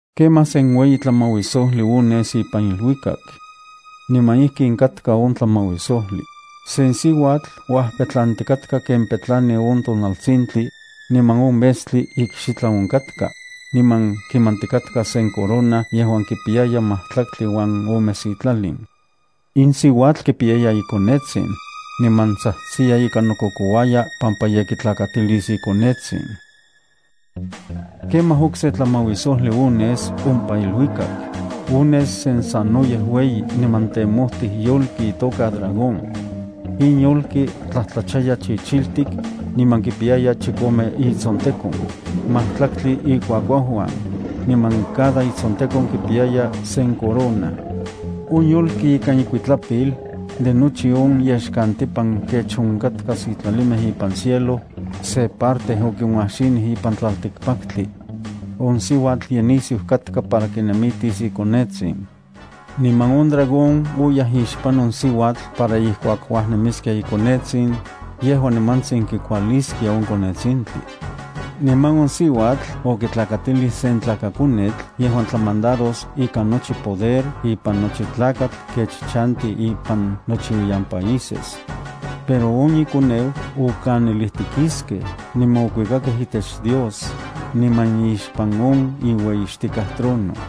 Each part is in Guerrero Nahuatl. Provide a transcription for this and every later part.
Kemaj sen ueyi tlamauisojli ones ipan iluikak. Niman ijkin katka on tlamauisojli: sen siuatl uajpetlantikatka ken petlani on tonaltsintli, niman on metstli ikxitlan onkatka, niman kimantikatka sen corona yejuan kipiyaya majtlaktli uan ome sitlalin. In siuatl kipiyaya ikonetsin, niman tsajtsiya ika nokokouaya pampa ye kitlakatilis ikonetsin. Kemaj okse tlamauisojli ones ompa iluikak: ones sen sanoyej ueyi niman temojtij yolki itoka dragón. In yolki tlajtlachaya chichiltik, niman kipiyaya chikome itsontekon, majtlaktli ikuakuauuan, niman cada itsontekon kipiyaya sen corona. On yolki ikan ikuitlapil, de nochi on yexkantipan kech onkatkaj sitlalimej ipan cielo, se parte okinuajxinij ipan tlaltikpaktli. On siuatl ye nisiu katka para kinemitis ikonetsin. Niman on dragón oyaj ixpan on siuatl para ijkuak uajnemiskia ikonetsin, yejua nimantsin kikualiskia on konetsintli. Niman on siuatl okitlakatilij sen tlakakonetl yejuan tlamandaros ikan nochi poder ipan nochi tlakatl kech chanti ipan nochiuiyan países. Pero on ikoneu okanilijtikiskej niman okuikakej itech Dios, niman ixpan on iueyixtikaj trono.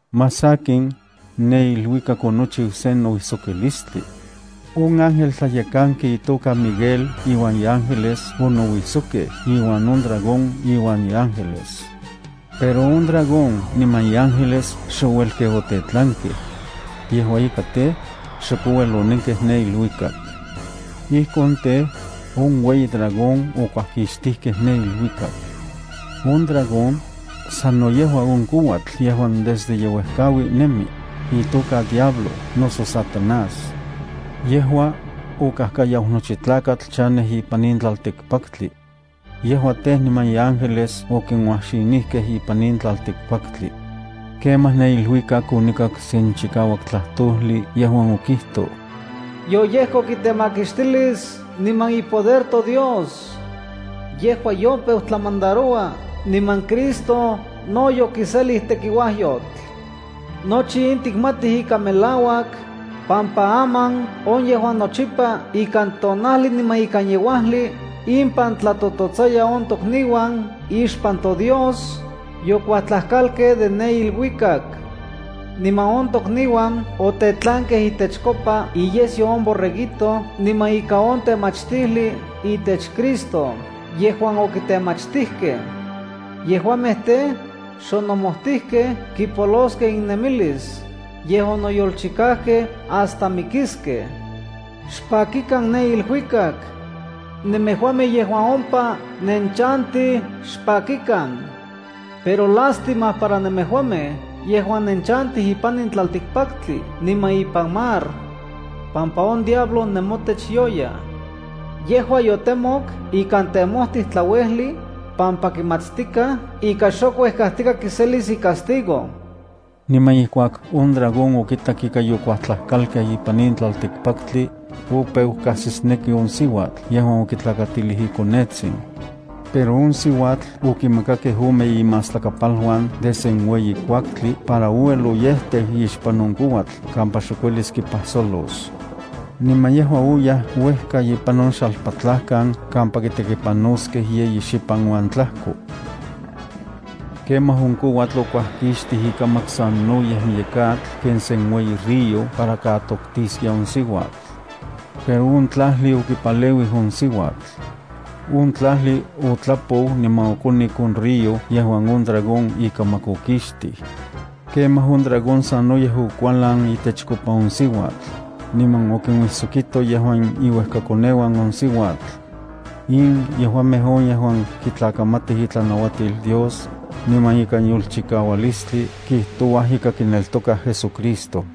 Más sakin, ne iluikak onochiu sen nouijsokilistli. On ángel tlayekanki itoka Miguel iuan iángeles onouijsokkej iuan on dragón iuan iángeles. Pero on dragón niman iángeles xouelkej otetlankej. Yejua ika tej, xok ouel onenkej ne iluikak. Ijkon tej, on ueyi dragón okuajkixtijkej ne iluikak. On dragón, sano yejua on kouatl yejuan desde yeuejkaui nemi, itoka diablo noso Satanás. Yejua okajkayau nochi tlakatl chanej ipan in tlaltikpaktli. Yejua tej, niman iángeles okinuajxinijkej ipan in tlaltikpaktli. Kemaj ne iluikak onikak sen chikauak tlajtojli yejuan okijtoj: Yoyejkok itemakixtilis niman ipoder toDios. Yejua yopeu tlamandaroua, niman Cristo no yokiselij tekiuajyotl. Nochi in tikmatij ika melauak, pampa aman on yejuan nochipa ikan tonajli niman ikan yeuajli impan tlatototsaya on tokniuan ixpan toDios, yokuajtlajkalkej de ne iluikak. Niman on tokniuan otetlankej itechkopa iyesyo on Borreguito niman ika on temachtijli itech Cristo yejuan okitemachtijkej. Yejuamej tej, xonomojtijkej kipoloskej innemilis, yej onoyolchikajkej hasta mikiskej. Xpakikan ne iluikak. Nemejuamej yejuan ompa nenchantij, xpakikan. Pero ¡lástima para nemejuamej yejuan nenchantij ipan in tlaltikpaktli niman ipan mar! pampa on diablo nemotech yoyaj. Yejua yotemok ikan temojtij tlauejli, pampa kimatstikaj ika xok uejkajtika kiselis icastigo. Niman ijkuak on dragón okitak ika yokuajtlajkalkej ipan in tlaltikpaktli, opeu kajsisneki on siuatl yejuan okitlakatilij ikonetsin. Pero on siuatl okimakakej ome inmastlakapaluan de se ueyi kuaktli para ouel oyejteu ixpan on kouatl kampa xok uelis kipajsolos. Niman yejua oyaj uejka ipan on xalpatlajkan kampa kitekipanoskej yeyi xipan uan tlajko. Kemaj on kouatl okuajkixtij ikamak sanoyej miyek atl ken sen ueyi río para katoktiskia on siuatl. Pero on tlajli okipaleuij on siuatl. On tlajli otlapou niman okonik on río yejuan on dragón ikamak okixtij. Kemaj on dragón sanoyej okualan itechkopa on siuatl, niman okinuisokito yejuan iuejkakoneuan on siuatl. In yejuamej on yejuan kitlakamatij itlanauatil Dios, niman ikan yolchikaualistli kijtouaj ika kineltokaj JesuCristo.